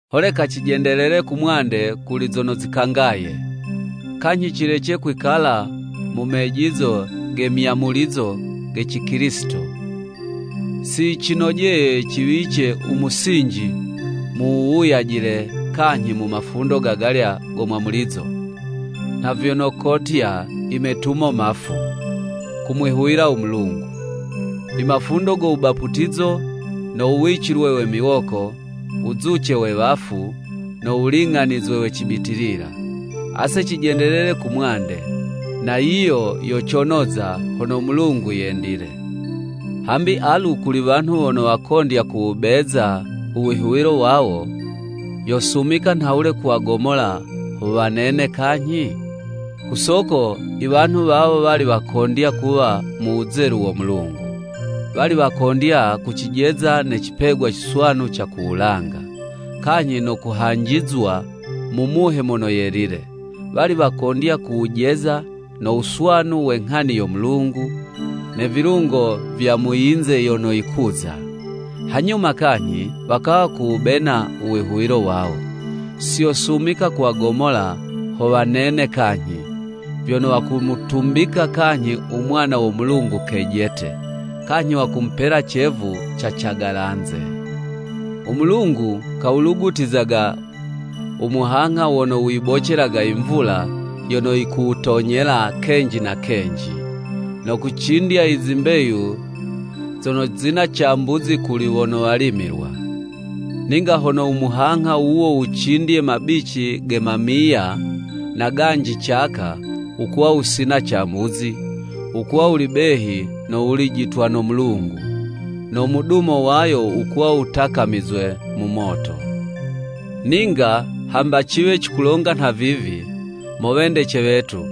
Holeka cijendelele kumwande kuli zono zikangaye, kanyhi cilece kwikala mu mejizo ge myamulizo ge Cikilisito. Si yicinojeye ciwice u musinji mu wuwuyajila kanyhi mu mafundo gagalya go mwamulizo, nha vyono kotya i metumo mafu, kumwihuwila u Mulungu, i mafundo go wubaputizo, no wuwicilwe we miwoko, wuzuce we wafu, no wuling'anizwe we cibitilila. Ase cijendelele kumwande! Na yiyo yo conoza, hono u Mulungu yendile. Hambi alu kuli wanhu wono wakondya kuwubeza u wihuwilo wawo, yosumika nhawule kuwagomola ho wanene kanyhi? Ku soko i wanhu wawo wali wakondya kuwa mu wuzelu wo Mulungu, wali wakondya kucijeza ne cipegwa ciswanu ca ku wulanga, kanyhi no kuhanjizwa mu Muhe Mono Yelile, wali wakondya kuwujeza no wuswanu we nghani yo Mulungu, ne vilungo vya mu yinze yono yikuza, hanyuma kanyhi wakawa kuwubena u wihuwilo wawo! Si yosumika kuwagomola ho wanene kanyhi, vyono wakumutumbika kanyhi u Mwana wo Mulungu kejete, kanyhi wakumupela cevu ca cagalanze. U Mulungu kawulugutizaga u muhangha wono wuyibocelaga i mvula yono yikuwutonyela kenji na kenji, no kucindya i zimbeyu zono zina cambuzi kuli wono walimilwa. Ninga hono u muhangha wuwo wucindye mabici ge mamiya, na ganji caka, wukuwa wusina cambuzi, wukuwa wuli behi no wulijitwa no Mulungu, no mudumo wayo wukuwa wutakamizwe mu moto. Ninga hamba ciwe cikulonga nhavivi, mo wendece wetu,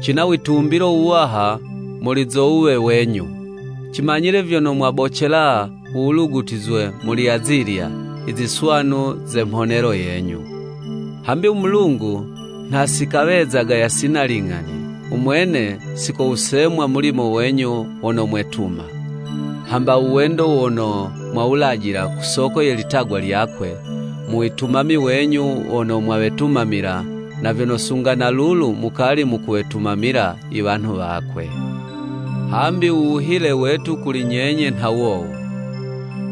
cina witumbilo wuwaha muli zo wuwe wenyu, cimanyile vyono mwabocela u wulugutizwe muli azilya i ziswanu ze mhonelo yenyu. Hambi u Mulungu nha si kawezaga yasina ling'ani, u mwene si kowusemwa mulimo wenyu wono mwetuma, hamba u wendo wono mwawulajila ku soko ye litagwa lyakwe, mu witumami wenyu wono mwawetumamila, na vyono sunga na lulu mukali mukuwetumamila i wanhu wakwe. Hambi u wuhile wetu kuli nyenye nha wowu,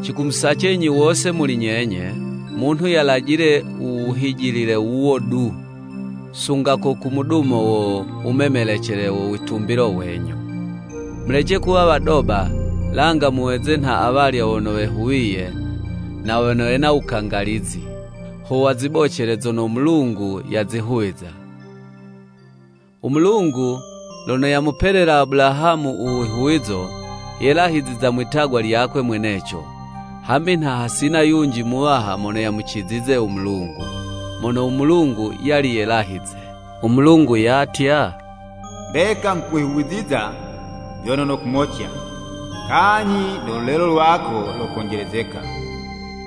cikumusacenyi wose muli nyenye, munhu yalajile u wuhijilile wuwo du, sunga ko ku mudumo wo wumemelecele wo witumbilo wenyu. Mulece kuwa wadoba, langa muweze nha awalya wono wehuwiye, na wono wena u wukangalizi, ho wazibocele zono u Mulungu yazihuwiza. U Mulungu lono yamupelela Abulahamu u wihuwizo, yelahiziza mwitagwa lyakwe mweneco, hambi nha hasina yunji muwaha mono yamucizize u Mulungu, mono u Mulungu yali yelahize. U Mulungu yatya, “Mbeka nghukwihuwiza vyono nokumotya, kanyhi no lulelo lwako lokonjelezeka.”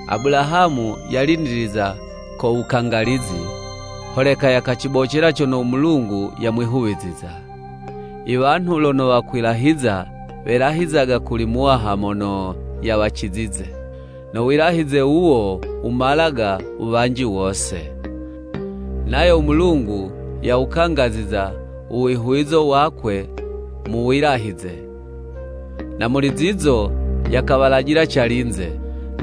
Abulahamu yalindiliza ko wukangalizi, holeka yakacibocela cono u Mulungu yamwihuwiziza. I wanhu lono wakwilahiza, welahizizaga kuli muwaha mono yawacizize, no wilahize wuwo wumalaga u wuwanji wose. Nayo u Mulungu, yawukangaziza u wihuwizo wakwe mu wilahize, na muli zizo, yakawalajila calinze,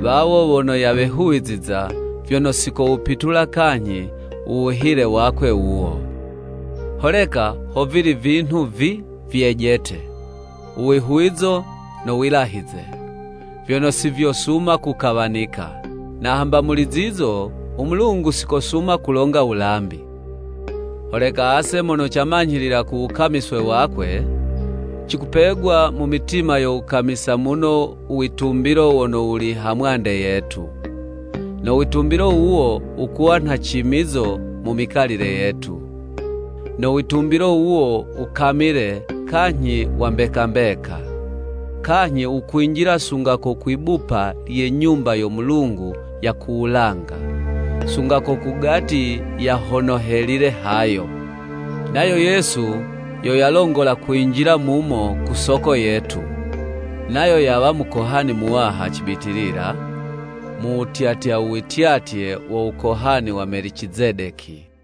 wawo wono yawehuwiziza, vyono si kowupitula kanyhi u wuhile wakwe wuwo. Holeka ho vili vinhu vi vyejete, u wihuwizo no wilahize, vyono si vyosuma kukawanika, na hamba muli zizo, u Mulungu si kosuma kulonga wulambi. Holeka ase mono camanyhilila ku wukamiswe wakwe, cikupegwa mu mitima yo wukamisa muno u witumbilo wono wuli ha mwande yetu. No witumbilo wuwo wukuwa nha cimizo mu mikalile yetu. No witumbilo wuwo wukamile kanyhi wa mbeka mbeka, kanyhi wukwinjila sunga ko kwi'bupa lye Nyumba yo Mulungu ya ku wulanga, sunga ko kugati ya hono helile hayo. Nayo Yesu yo yalongola kwinjila mumo ku soko yetu, nayo yawa Mukohani Muwaha cibitilila, mu wutyatya u wityatye wo wukohani wa Melicizedeki.